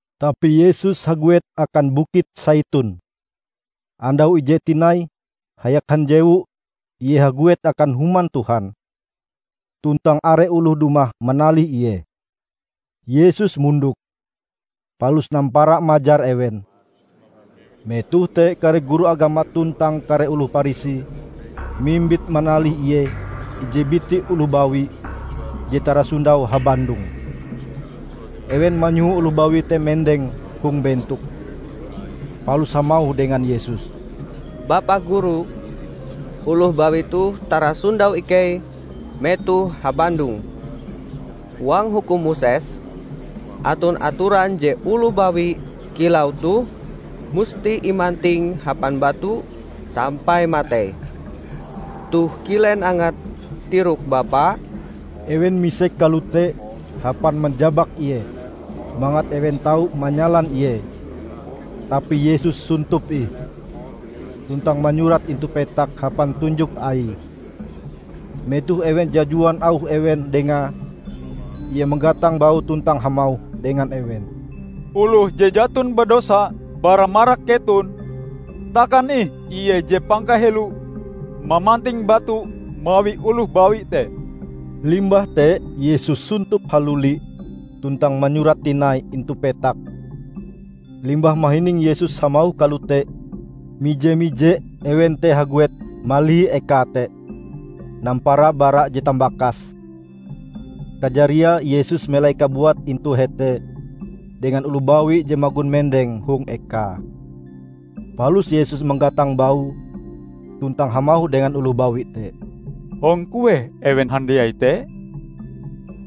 Tapi Yesus haguet akan Bukit Saiton. Andau ije tinai hayak hanjewu Ie haguet akan Human Tuhan, tuntang are oloh dumah manalih Ie. Yesus mondok, palus nampara majar ewen. Metoh te kare guru agama tuntang kare oloh Parisi mimbit manalih Ie ije biti oloh bawi je tarasondau habandong. Ewen manyoho oloh bawi te mendeng hong bentok, palus hamauh dengan Yesus, "Bapa Guru, oloh bawi toh tarasondau ikei metohe habandong. Huang Hukum Moses aton atoran je oloh bawi kilau toh musti imanting hapan batu sampai matei. Toh kilen angat tirok bapa?" Ewen misek kalote hapan manjabak Ie, mangat ewen tau manyalan Ie. Tapi Yesus sontop ih, tuntang manyurat intu petak hapan tunjok Aie. Metoh ewen jajuan auh ewen Dengae, Ie manggatang baue tuntang hamauh dengan ewen, "Oloh je jaton badosa bara marak keton, takan ih ie je pangkaheloe mamanting batu mawi oloh bawi te." Limbah te Yesus sontop haluli tuntang manyurat tinai intu petak. Limbah mahining Yesus hamauh kalote, mije-mije ewen te haguet malihi eka te, nampara bara je tambakase. Kajariae Yesus melai kabuate intu hete dengan oloh bawi je magon mendeng hong ekae. Palus Yesus manggatang baue tuntang hamauh dengan oloh bawi te, "Hong kueh ewen handiai te?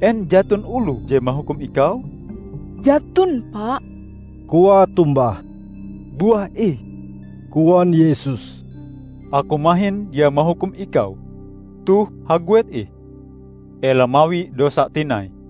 En jaton oloh je mahukum ikau?" "Jaton, Pa," koae tombah. "Buah ih," koan Yesus, "Aku mahin dia mahukum ikau. Toh haguet ih, ela mawi dosa tinai."]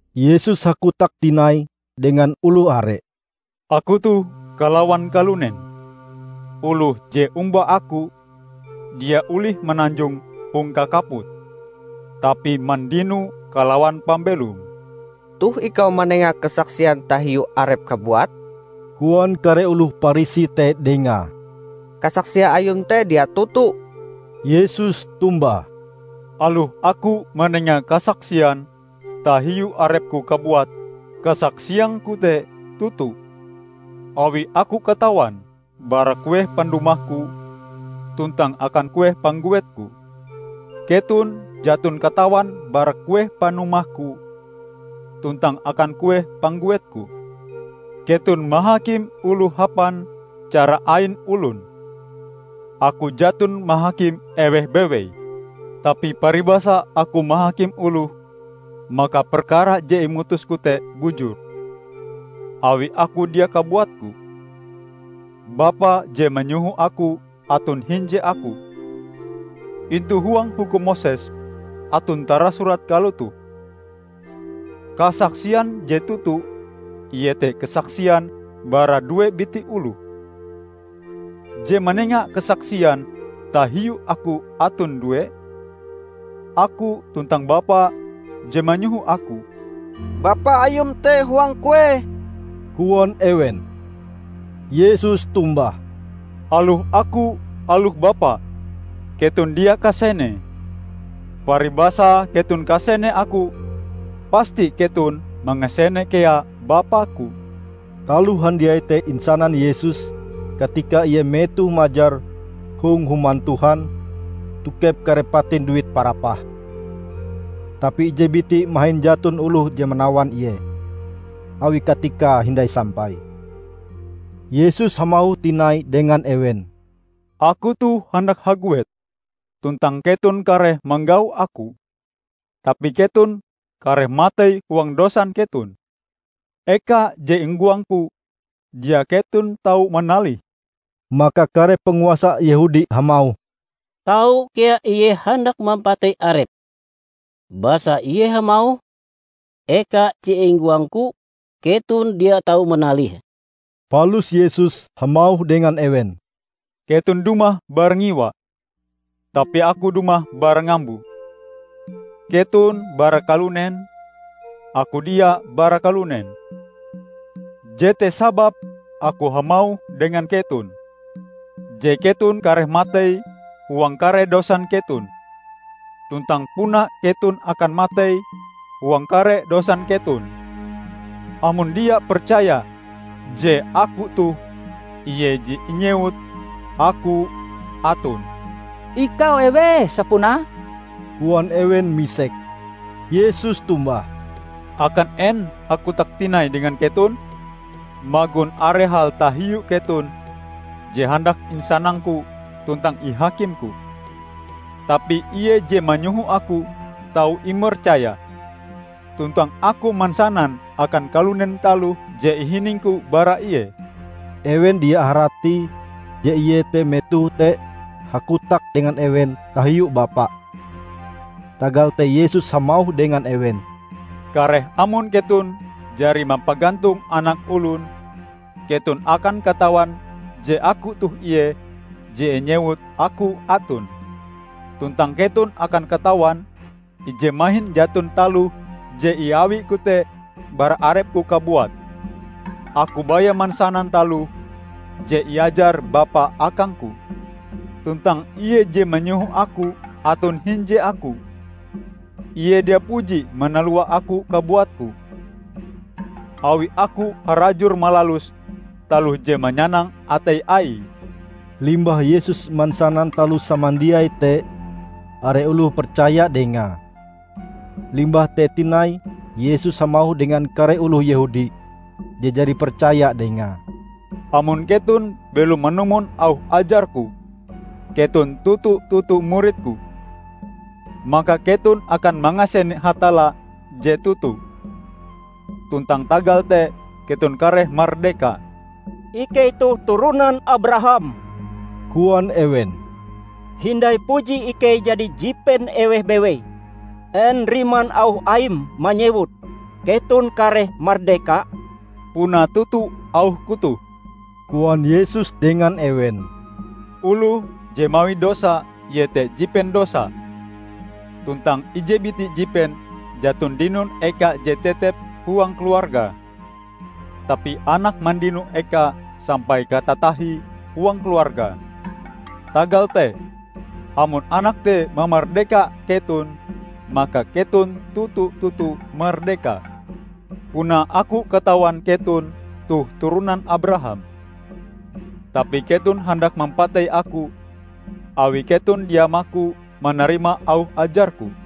Yesus hakotak tinai dengan oloh are, "Aku toh kalawan kalunen. Oloh je omba Aku dia olih mananjong hong kakaput, tapi mandino kalawan pambelom." "Toh ikau manenga kasaksian tahiu arepm kabuat," koan kare oloh Parisi te dengae, "Kasaksia Ayum te dia toto." Yesus tombah, "Aloh Aku manenga kasaksian tahiu arep-Ku kabuat, kasaksiang-Ku te toto; awi Aku katawan bara kueh pandumah-Ku tuntang akan kueh pangguet-Ku. Keton jaton katawan bara kueh panumah-Ku tuntang akan kueh pangguet-Ku. Keton mahakim oloh hapan cara ain olon; Aku jaton mahakim eweh bewei. Tapi paribasa Aku mahakim oloh, maka perkara je imutus-Ku te bujur, awi Aku dia kabuat-Ku; Bapa je manyoho Aku aton hinje Aku. Intu huang Hukum Moses aton tarasurat kalotoh: Kasaksian je toto iete kasaksian bara due biti oloh. Je manenga kasaksian tahiu Aku aton due -- Aku tuntang Bapa je manyoho Aku." "Bapa Ayum te huang kueh?" koan ewen. Yesus tombah, "Aloh Aku, aloh Bapa, keton dia kasenee. Paribasae keton kasene Aku, pasti keton mangasene kea Bapa-Ku." Taloh handiai te insanan Yesus katika Ie metoh majar hong Human Tuhan tokep kare patin duit parapah. Tapi ije biti mahin jaton oloh je manawan Ie, awi katikae hindai sampai. Yesus hamauh tinai dengan ewen, "Aku toh handak haguet, tuntang keton kareh manggau Aku, tapi keton kareh matei huang dosan keton. Eka je inggoang-Ku, dia keton tau manalihe." Maka kare panguasa Yehudi hamauh, "Tau kea Ie handak mampatei Arepe, basa Ie hamauh, 'Eka je inggoang-Ku, keton dia tau manalihe.' " Palus Yesus hamauh dengan ewen, "Keton dumah bara ngiwa; tapi Aku dumah bara ngambo. Keton bara kalunen; Aku dia bara kalunen. Jete sababe Aku hamauh dengan keton, je keton kareh matei huang kare dosan keton. Tuntang puna keton akan matei huang kare dosan keton, amon dia percaya je 'Aku toh Ie je inyewut AKU ATON'." "Ikau eweh sapunae?" koan ewen misek. Yesus tombah, "Akan en hakotak tinai dengan keton! Magon are hal tahiu keton je handak isanang-Ku tuntang ihakim-Ku. Tapi Ie je manyoho Aku tau imercaya. Tuntang Aku mansanan akan kalunen taloh je ihining-Ku bara Ie." Ewen dia haratie je Ie te metoh te hakotak dengan ewen tahiu Bapa. Tagal te Yesus hamauh dengan ewen, "Kareh amon keton jari mampagantong Anak Olon, keton akan katawan je 'Aku toh Ie je inyewut AKU ATON', tuntang keton akan katawan, ije mahin jaton taloh je iawi-Ku te bara arep-Ku kabuat. Aku baya mansanan taloh je iajar Bapa akang-Ku. Tuntang Ie je manyoho Aku aton hinje Aku. Ie dia puji manalua Aku kabuatku, awi Aku harajur malalus taloh je manyanang atei Aie." Limbah Yesus mansanan taloh samandiai te, are oloh percaya dengae. Limbah te tinai Yesus hamauh dengan kare oloh Yehudi je jari percaya dengae, "Amon keton belom manumon auh ajar-Ku, keton toto-toto murid-Ku, maka keton akan mangasene Hatalla je toto, tuntang tagal te keton kareh mardeka." "Ikei toh turonan Abraham," koan ewen. "Hindai puji ikei jadi jipen eweh bewei! En riman auh Aim manyewut, 'Keton kareh mardeka'?" "Puna toto auh-Ku toh," koan Yesus dengan ewen. "Oloh je mawi dosa, ie te jipen dosa. Tuntang ije biti jipen jaton dinon eka je tetep huang keluarga, tapi anak mandino eka sampai katatahie huang keluarga. Tagal te, amon Anak te mamardeka keton maka keton toto-toto mardeka. Puna Aku katawan keton toh turonan Abraham. Tapi keton handak mampatei Aku awi keton dia maku manarima auh ajar-Ku.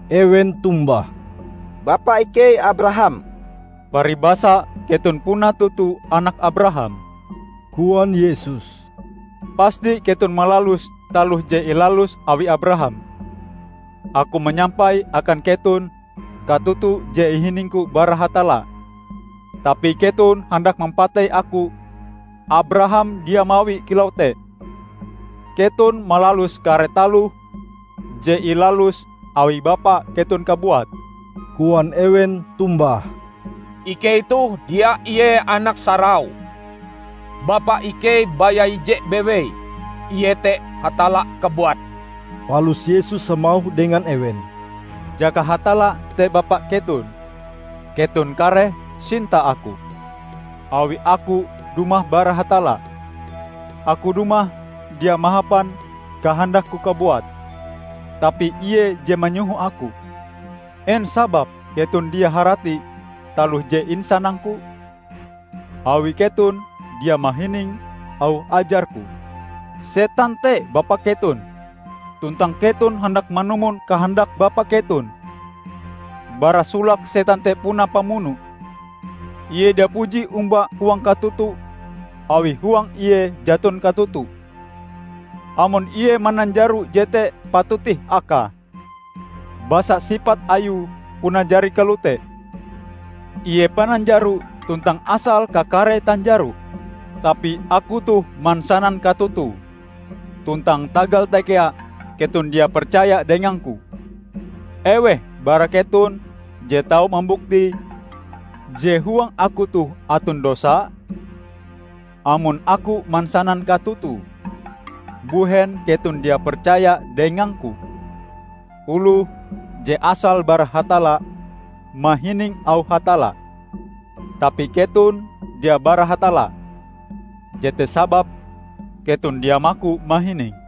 Ewen tombah, "Bapa ikei Abraham." "Paribasa keton puna toto anak Abraham," koan Yesus, "pasti keton malalus taloh je ilalus awi Abraham. Aku manyampai akan keton katoto je ihining-Ku bara Hatalla. Tapi keton handak mampatei Aku. Abraham dia mawie kilau te! Keton malalus kare taloh je ilalus awi bapa keton kabuat." Koan ewen tombah, "Ikei toh dia ie anak sarau. Bapa ikei baya ije bewei, iete Hatalla kabuat." Palus Yesus hamauh dengan ewen, "Jaka Hatalla te Bapa keton, keton kareh sinta Aku, awi Aku dumah bara Hatalla. Aku dumah dia mahapan kahandak-Ku kabuat, tapi Ie je manyoho Aku. En sababe keton dia harati taloh je isanang-Ku? Awi keton dia mahining auh ajar-Ku. Setan te bapa keton, tuntang keton handak manumon kahandak bapa keton. Bara solake setan te puna pamuno. Ie dia puji omba huang katoto, awi huang ie jaton katoto. Amon ie mananjaro jete patut ih akae, basa sipat ayue puna jari kalote. Ie pananjaro tuntang asal kakare tanjaro. Tapi Aku toh mansanan katoto, tuntang tagal te kea keton dia percaya dengang-Ku. Eweh bara keton je tau mambuktie je huang Aku toh aton dosa? Amon Aku mansanan katoto, mbuhen keton dia percaya dengang-Ku? Oloh je asale bara Hatalla, mahining auh Hatalla. Tapi keton dia bara Hatalla, jete sababe keton dia maku mahining."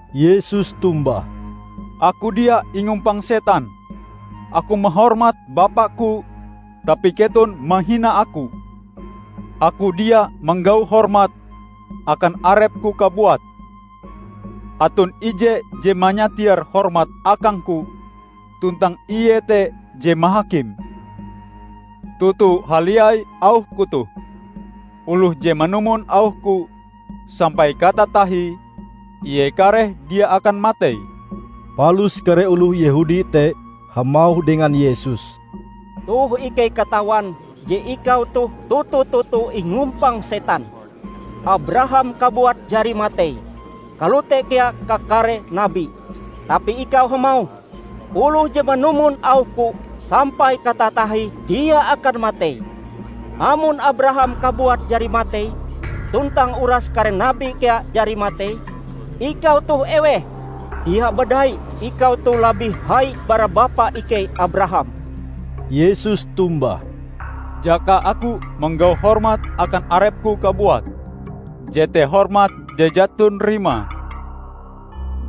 Yesus tombah, "Aku dia ingumpang setan. Aku mahormat Bapa-Ku, tapi keton mahina Aku. Aku dia manggau hormat akan arep-Ku kabuat. Aton Ije je manyatiar hormat akang-Ku, tuntang Ie te je mahakim. Toto haliai auh-Ku toh, oloh je manumon auh-Ku, sampai katatahie ie kareh dia akan matei." Palus kare oloh Yehudi te hamauh dengan Yesus, "Toh ikei katawan je ikau toh toto-toto ingumpang setan! Abraham kabuat jari matei, kalote kea kakare nabi. Tapi ikau hamauh, 'Oloh je manumon auh-Ku, sampai katatahie dia akan matei.' Amon Abraham kabuat jari matei, tuntang uras kare nabi kea jari matei, ikau toh eweh? Dia badai ikau toh labih hai bara bapa ikei Abraham!" Yesus tombah, "Jaka Aku manggau hormat akan arep-Ku kabuat, jete hormat je jaton rimae.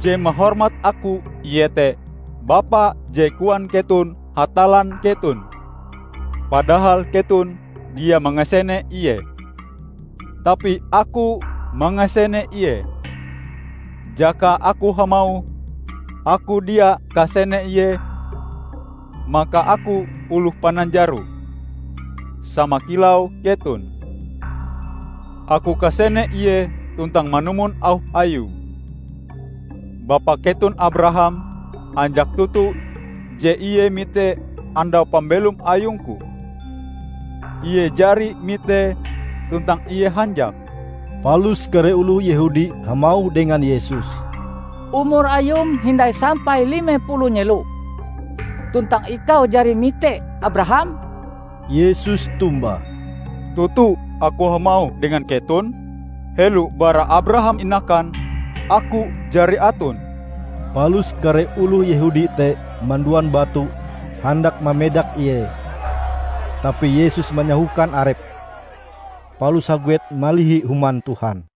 Je mahormat Aku iete Bapa je koan keton Hatallan keton, padahal keton dia mangasene Ie. Tapi Aku mangasene Ie. Jaka Aku hamauh Aku dia kasene Ie, maka Aku oloh pananjaro, sama kilau keton. Aku kasene Ie tuntang manumon auh Ayue. Bapa keton Abraham hanjak toto je ie mite andau pambelom ayung-Ku. Ie jari mitee tuntang ie hanjak!" Palus kare oloh Yehudi hamauh dengan Yesus, "Umur Ayum hindai sampai lime puluh nyelo, tuntang ikau jari mite Abraham?" Yesus tombah, "Toto Aku hamauh dengan keton: helo bara Abraham inakan, Aku jari aton." Palus kare oloh Yehudi te manduan batu handak mamedak Ie; tapi Yesus manyahokan arepe, palus haguet malihi Human Tuhan.